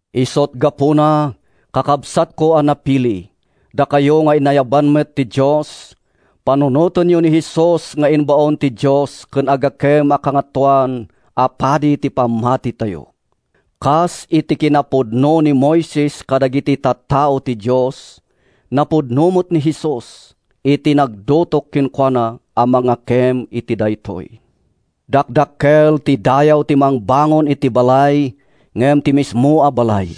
Isut’ gapuna, kakabsatko a napili, dakayo nga inayaban met ti Dios, panunotenyo ni Jesus nga imbaon ti Dios ken agakem a Kangatoan a Padi ti pammatitayo. Kas iti kinapudno ni Moises kadagiti tattao ti Dios, napudno met ni Jesus iti nangdutok kenkuana a mangakem iti daytoy. Dakdakkel ti dayaw ti mangbangon iti balay ngem ti mismo a balay.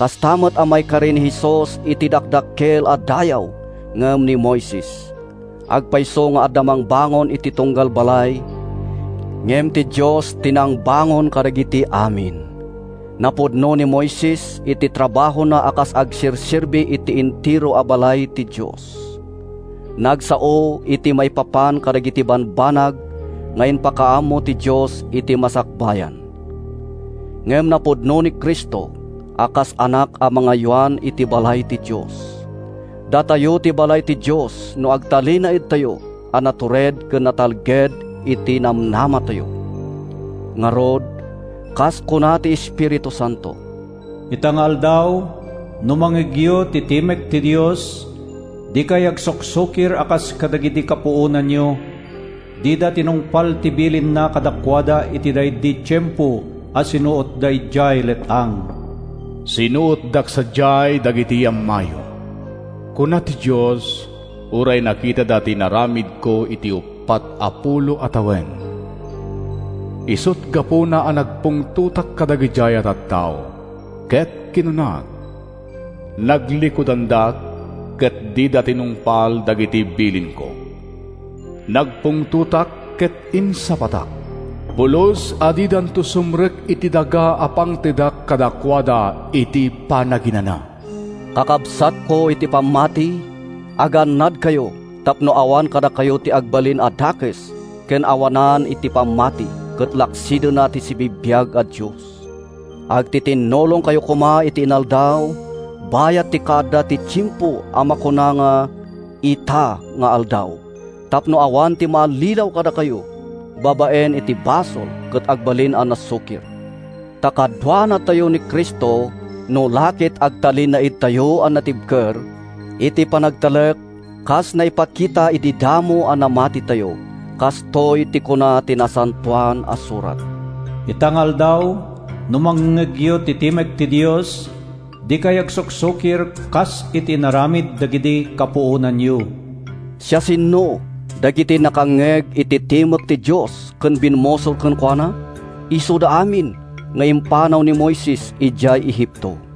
Kasta met a maikari ni Jesus iti dakdakkel a dayaw ngem ni Moises. Agpayso nga adda mangbangon iti tunggal balay, ngem ti Dios ti nangbangon kadagiti amin. Napudno ni Moises iti trabahona a kas agserserbi iti entero a balay ti Dios. Nagsao iti maipapan kadagiti bambanag nga ipakaammo ti Dios iti masakbayan. Ngem napudno ni Cristo a kas Anak a mangaywan iti balay ti Dios. Datayo ti balay ti Dios no agtalinaedtayo a natured ken natalged iti namnamatayo. Ngarud, kas kuna ti Espiritu Santo: “Ita nga aldaw, no mangngegyo ti timek ti Dios, Dikay agsuksukir a kas kadagidi kapuonanyo, Dida tinungpal ti bilinna kadakuada iti daydi tiempo a sinuotda idiay let-ang. Sinuotdak sadiay dagiti ammayo, kuna ti Dios Uray nakitada ti inaramidko iti uppat a pulo a tawen. Isut’ gapuna a nagpungtotak kadagidiay a tattao, Ket kinunak, ‘Naglikudandak, ket dida tinungpal dagiti bilinko.’ Nagpungtotak ket insapatak: ‘Pulos a didanto sumrek iti daga a pangtedak kadakuada iti panaginana!’” Kakabsatko iti pammati, agannadkayo tapno awan kadakayo ti agbalin a dakes ken awanan iti pammati ket laksidenna ti sibibiag a Dios. Agtitinnulongkayo koma iti inaldaw bayat ti kaadda ti tiempo a makuna nga “ita nga aldaw” tapno awan ti maallilaw kadakayo babaen iti basol ket agbalin a nasukir. Ta kaduanatayo ni Cristo no la ket agtalinaedtayo a natibker iti panagtalek kas naipakita idi damo a namatitayo. Kastoy ti kuna ti Nasantoan a Surat: “Ita nga aldaw, no mangngegyo ti timek ti Dios, Dikay agsuksukir kas iti inaramid dagidi kapuonanyo.” Siasino dagiti nakangngeg iti timek ti Dios ken bimmusor kenkuana? Isuda amin nga impanaw ni Moises idiay Egipto.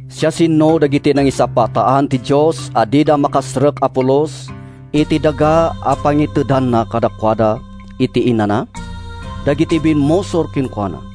Siasino dagiti nangisapataan ti Dios a dida makastrek a pulos iti daga a pangitedanna kadakuada iti inana? Dagiti bimmusor kenkuana.